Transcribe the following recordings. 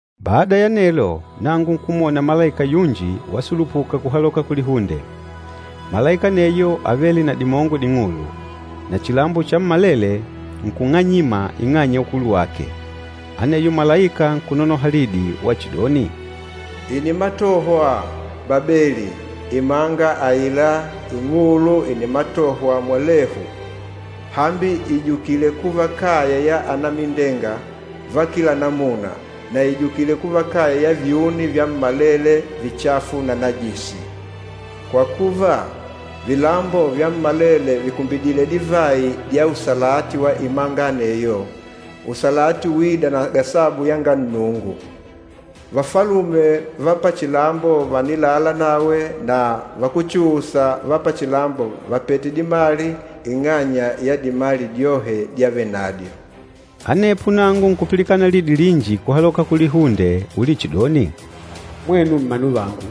Bada ya anelo, nangu nkumwona malaika yunji wasulupuka kuhaloka kulihunde. Malaika aneyo ávele na dimongo ding'ulu, na chilambo chammalele nkung'anyima ing'anya ya ukulu wake. Aneyo malaika nkunonoha lidi wachidoni, “Ìnimatohwa! Babeli, imanga aila ing'ulu ìnimatohwa mwalehu! Hambi ìjukile kuva kaya ya anamindenga va kila namuna, na ìjukile kuva kaya ya vyuni vyammalele vichafu na najisi. Kwa kuva, vilambo vyammalele vìkumbidile divayi dya usalati wa imanga aneyo, usalati uîda na gasabu yanga Nnungu. Vafalume va pachilambo vànilala nawe na vakúchuusa va pachilambo vàpete dimali ing'anya ya dimali dyohe dyavenandyo.” Anepo nangu nkupilikana lidi linji kuhaloka kulihunde ulichidoni, “Mwenu mmanu vangu,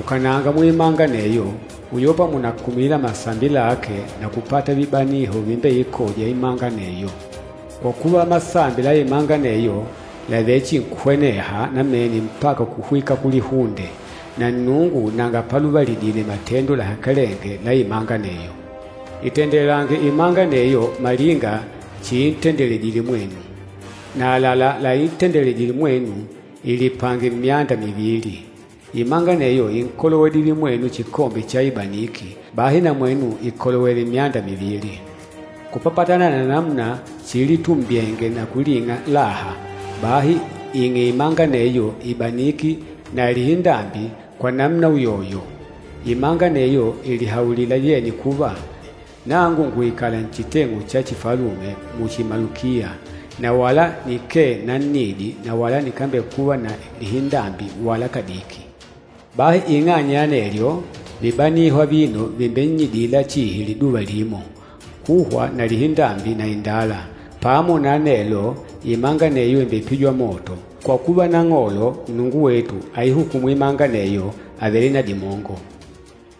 ukananga muimanga aneyo, uyopa mùnakumila masambi lake na kupata vibaniho vimbeikôja imanga aneyo. Kwa kuva, masambi la imanga aneyo làvechinkuhweneha namene mpaka kuhwika kulihunde, na Nnungu nanga paluvalidile matendo lahakalenge la imanga aneyo. Itendelange imanga aneyo malinga chiintendeledile mwenu. Na àlalá laintendedile mwenu, ilipange myanda mivili. Imanga aneyo ínkolowedile mwenu chikombe cha ibaniki, bahi na mwenu ikolowele myanda mivili. Kupapatana na namuna chiilitumbyenge na kuling'a laha, bahi ing'e imanga aneyo ibaniki na lihindambi kwa namuna uyoyo. Imanga aneyo ìlihaulila yenye kuva, ‘Nangu ngùikala nchiteng'u cha chifalume muchi malukiya, na wala nikee nannidi na wala nikambekuva na lihindambi wala kadiki.’ Bahi ing'anya ya anelyo, vibaniho avino vìmbennyidila chihi liduva limo, kuhwa na lihindambi na indala. Pamo na anelo, imanga aneyo ìmbepijwa moto, kwa kuva, Nang'olo Nnungu wetu aihukûmu imanga aneyo àvele na dimongo.”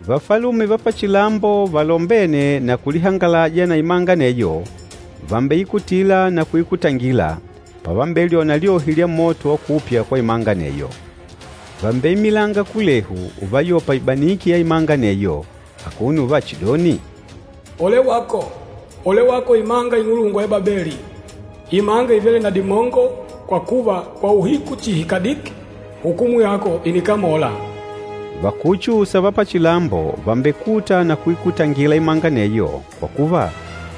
Vafalume va pachilambo valombêne na kulihangalaja na imanga aneyo vàmbeikutila na kuikutangila, pavambelyona lyohi lya moto wa kupya kwa imanga aneyo. Vàmbeimilanga kulehu uvayopa ibaniki ya imanga aneyo akuno uvachidoni, “Ole wako! Ole wako, imanga ing'ulungwa ya Babeli, imanga ivêle na dimongo! Kwa kuva, kwa uhiku chihi kadiki, hukumu yako ìnikamola!” Vakúchuusa va pachilambo vàmbekuta na kuikutangila imanga aneyo, kwa kuva,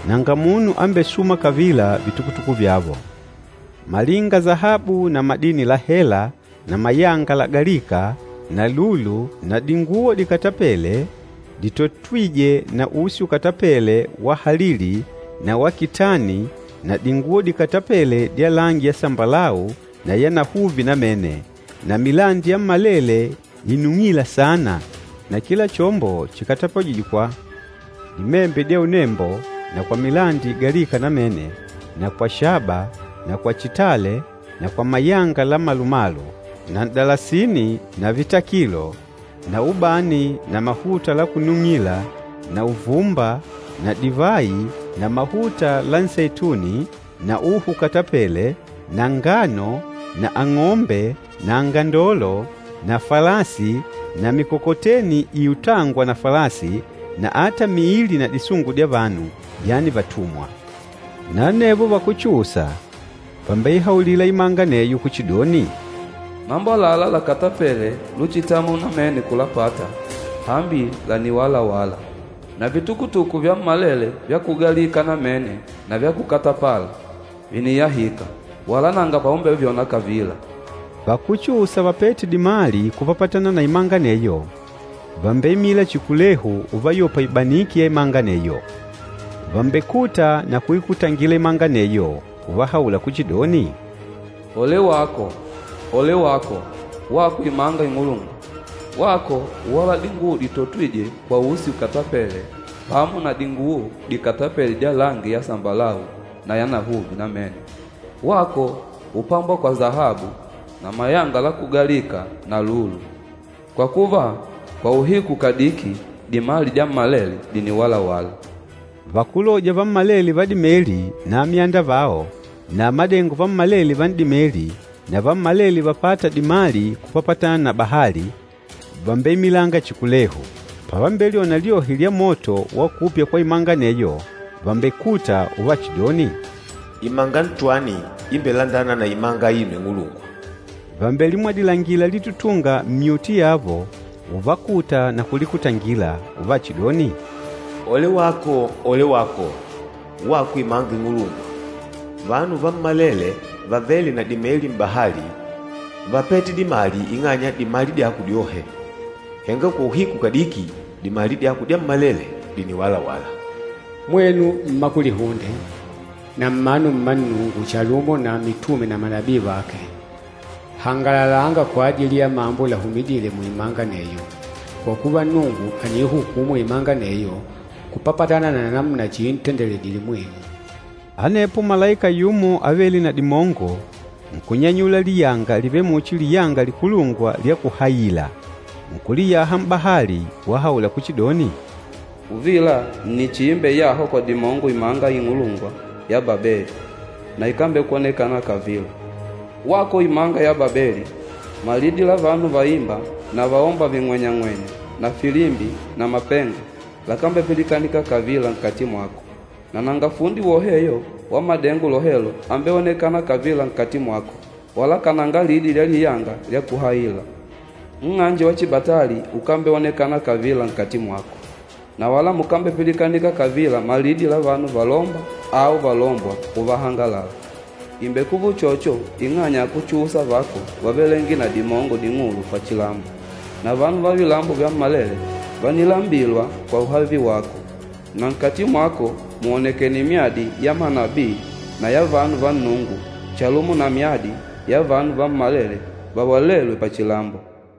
nanga munu ambesûma kavila vitukutuku vyavo, malinga sahabu na madini la hela na mayanga lagalîka na lulu na dinguwo dikatapêle ditotwîje na usi ukatapêle wa halili na wa kitani na dinguwo dikatapêle dya langi ya sambalau na ya nahuvi namene, na milandi yammalele inung'îla saana na kila chombo chikatapajîjwe kwa dimembe dya unembo na kwa milandi igalîka namene na kwa shaba na kwa chitale na kwa mayanga la malumalu, na n'dalasini na vitakilo, na ubani na mahuta la kunung'ila na uvumba na divayi na mahuta la nseituni na uhu ukatapêle na ngano na ang'ombe na angandolo na falasi na mikokoteni iutângwa na falasi na ata miili na disungu dya vanu, yani vatumwa. Na anevo vakúchuusa vàmbeihaulila imanga aneyo kuchidoni, “Mambo àlalá lakatapêle luchitamwa namene kulapata, hambi làniwalawala. Na vitukutuku vyammalele vya kugalika namene na vya kukatapala, vìniyahika, wala nanga paumbevyona kavila.” Vakúchuusa vapête dimali kupapatana na imanga aneyo, vàmbeimila chihi kulehu uvayopa ibaniki ya imanga aneyo. Vàmbekuta na kuikutangila imanga aneyo, uvahaula kuchidoni, “Ole wako! Ole wako, wako imanga ing'ulungwa! Wako úwala dinguwo ditotwîje kwa usi ukatapêle pamo na dinguwo dikatapele dya langi ya sambalau na yanahuvi namene. Wako úpambwa kwa sahabu na mayanga la kugalika na lulu! Kwa kuva, kwa uhiku kadiki, dimali dyammalele dìniwalawala.” Vakúloja vammalele va dimeli na amyanda vao, na amadengo vammalele va n'dimeli na vammalele vapâta dimali kupapatana na bahali, vàmbeimilanga chihi kulehu. Pavambelyona lyohi lya moto wa kupya kwa imanga aneyo, vàmbekuta uvachidoni, “Imanga ntwani imbelandâna na imanga aino ing'ulungwa!” Vàmbelimwadilangila litutunga mmyuti yavo, uvakuta na kulikutangila, uvachidoni, “Ole wako! Ole wako, wako imanga ing'ulungwa! Vanu vammalele vavêle na dimeli m'bahali vápete dimali ing'anya ya dimali dyako dyohe. Henga kwa uhiku kadiki, dimali dyako dyammalele dìniwalawala.” “Mwenu mma kulihunde na mmanu mma Nnungu chalumo na mitume na manabii vake, hangalalanga kwajili ya mambo lahumidîle muimanga aneyo, kwa kuva, Nnungu àniihukumu imanga aneyo kupapatana na namuna chiintendeledile mwenu!” Anepo malaika yumo avêle na dimongo nkunyanyula liyanga livêle muchi liyanga likulungwa lya kuhayila. Nkuliyaha m'bahali, wahaula kuchidoni, “Uvila nni chiimbeyahwa kwa dimongo imanga ing'ulungwa ya Babeli na ikambekwonekana kavila. Wako imanga ya Babeli, malidi la vanu vaîmba na vaômba ving'wenyang'wenya na filimbi na mapenga lakambepilikanika kavila nkati mwako. Na nanga fundi woheyo wa madengo lohelo ambeonekâna kavila nkati mwako, wala kananga lidi lya liyanga lya kuhayila. Nng'anje wa chibatali ukambeonekana kavila nkati mwako. Na wala mukambepilikanika kavila malidi la vanu valômba au valômbwa, uvahangalala. Ìmbekuva uchocho ing'anya akúchuusa vako vávelenge na dimongo ding'ulu pachilambo, na vanu va vilambo vyammalele vánilambilwa kwa uhavi wako, na nkati mwako mùonekene myadi ya manabii na ya vanu va Nnungu chalumo na myadi ya vanu vammalele vawalêlwe pachilambo.”